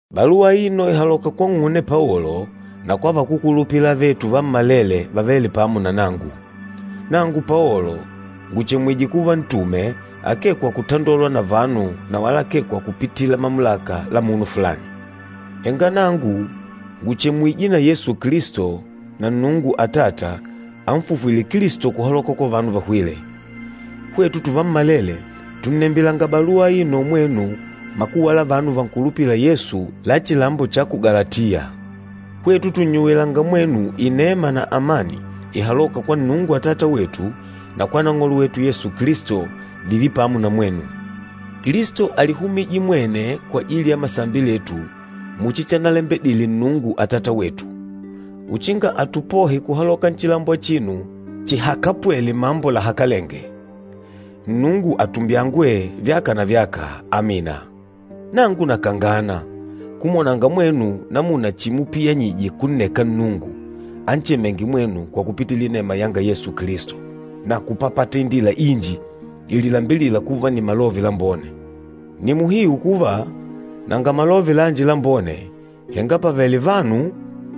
Baluwa aino ìhaloka kwang'une Paolo na kwa vakúkulupila avetu vammalele vavêle pamo na nangu. Nangu Paolo ngùchemwije kuva ntume, akee kwa kutandolwa na vanu na wala akee kwa kupitila mamulaka la munu fulani. Henga nangu ngùchemwije na Yesu Kilisto na Nnungu Atata anfufwîle Kilisto kuhaloka kwa vanu vahwîle. Hwetu tuvammalele tùnnembilanga baluwa aino mwenu makuwa la vanu vankulupîla Yesu la chilambo cha ku Galatiya. Hwetu tùnnyuwilanga mwenu inema na amani ihalôka kwa Nnungu Atata wetu na kwa Nang'olo wetu Yesu Kilisto, vììve pamo na mwenu. Kilisto álihumije mwene kwajili ya masambi letu muchi chanalembedile Nnungu Atata wetu, uchinga atupohe kuhaloka nchilambo achino chihakapwêle mambo lahakalenge. Nnungu atumbyangwe, vyaka na vyaka. Amina. Nangu nakangana, kumwonanga mwenu namuna chimupiyanyije kunneka Nnungu anchemênge mwenu kwa kupitila inema yanga Yesu Kilisto, na kupapata indila inji ililambilîla kuva nni Malove Lambone. Nni muhiu kuva, nanga Malove lanji Lambone, henga pàvele vanu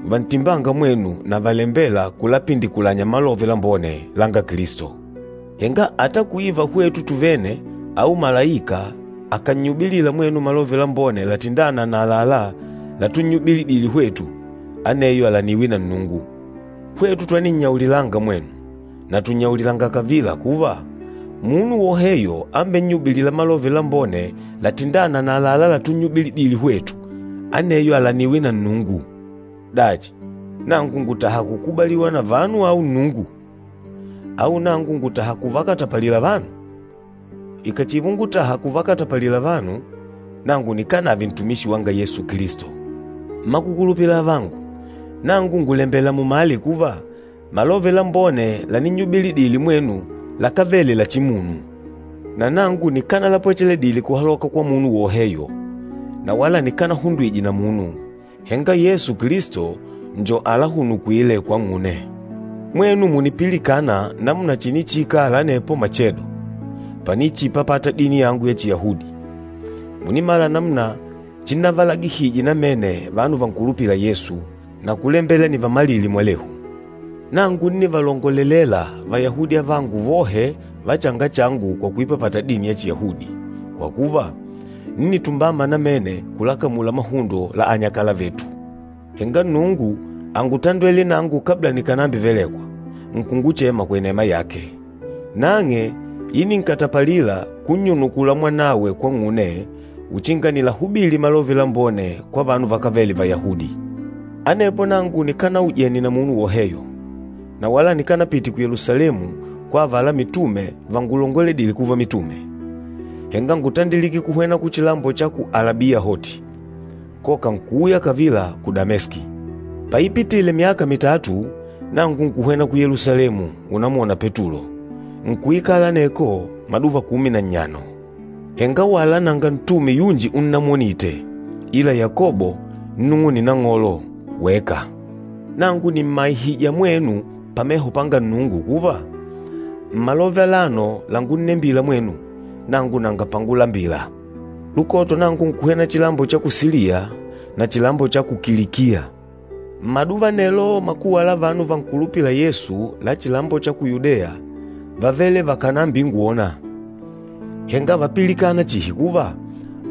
vantimbânga mwenu na valembêla kulapindikulanya Malove Lambone langa Kilisto. Henga ata kuiva hwetu tuvene au malaika akànnyubilila mwenu Malove Lambone latindâna na àlalá latunnyubilidile hwetu, aneyo alaniwe na Nnungu. Hwetu twaninnyaulilanga mwenu, na tùnnyaulilanga kavila kuva, munu woheyo ambennyubilîla Malove Lambone latindâna na àlalá latunnyubilidile hwetu, aneyo alaniwe na Nnungu. Dachi, nangu ngùtaha kukubaliwa na vanu au Nnungu? Au nangu ngùtaha kuvakatapalila vanu? Ikàchiva ungutàhà kuvakatapalila vanu, nangu nikánave ntumishi wanga Yesu Kilisto. Mmakukulupila avangu, nangu ngùlembela mumale kuva, Malove Lambone laninnyubilidile mwenu lakávele la chimunu. Nanangu nikánalapwechedile kuhaloka kwa munu woheyo, na wala nikánahundwije na munu, henga Yesu Kilisto njo alahunukwîle kwang'une. Mwenu mùnipilikana namuna chinichiikala anepo machedo, panichiipapata dini yangu ya Chiyahudi. Mùnimala namuna chinnavalagihije namene vanu vankulupîla Yesu, na kulembela nivamalile mwalehu. Nangu ńnivalongolelela Vayahudi avangu vohe va changa changu kwa kuipapata dini ya Chiyahudi, kwa kuva, ńnitumbama namene kulakamula mahundo la anyakala vetu. Henga Nnungu ángutandwele nangu kabla nikànambivelekwa, nkunguchema kwa inema yake. Nang'e íninkatapalila, kunnyunukula Mwanawe kwang'une uchinga nilahubili Malove Lambone kwa vanu vakávele Vayahudi. Anepo nangu nikanaujene na munu woheyo, na wala nikanapite ku Yelusalemu kwa avala mitume vangulongoledîle kuva mitume, henga ngútandilike kuhwena kuchilambo cha ku Alabiya hoti, koka nkuuya kavila ku Dameski. Paipitile myaka mitatu, nangu nkuhwena ku Yelusalemu unamwona Petulo, nkuikala aneko maduva kumi na nnyano. Henga wala nanga ntume yunji unnamwonite, ila Yakobo nnung'une Nang'olo weka. Nangu nìmmaihija mwenu pameho panga Nnungu kuva, mmalove alano langunnembila mwenu, nangu nanga pangulambila. Lukoto, nangu nkuhwena chilambo cha ku Siliya na chilambo cha ku Kilikiya. Mmaduva anelo makuwa la vanu vankulupîla Yesu la chilambo cha ku Yudeya vávele vakànambingwona, henga vápilikana chihi kuva,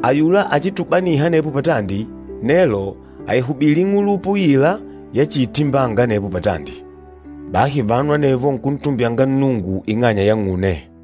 “Ayula achitubaniha anepo patandi, nelo àihubili ing'ulupa uila yachiitimbanga anepo patandi.” Bahi vanu anevo nkuntumbyanga Nnungu ing'anya yang'une.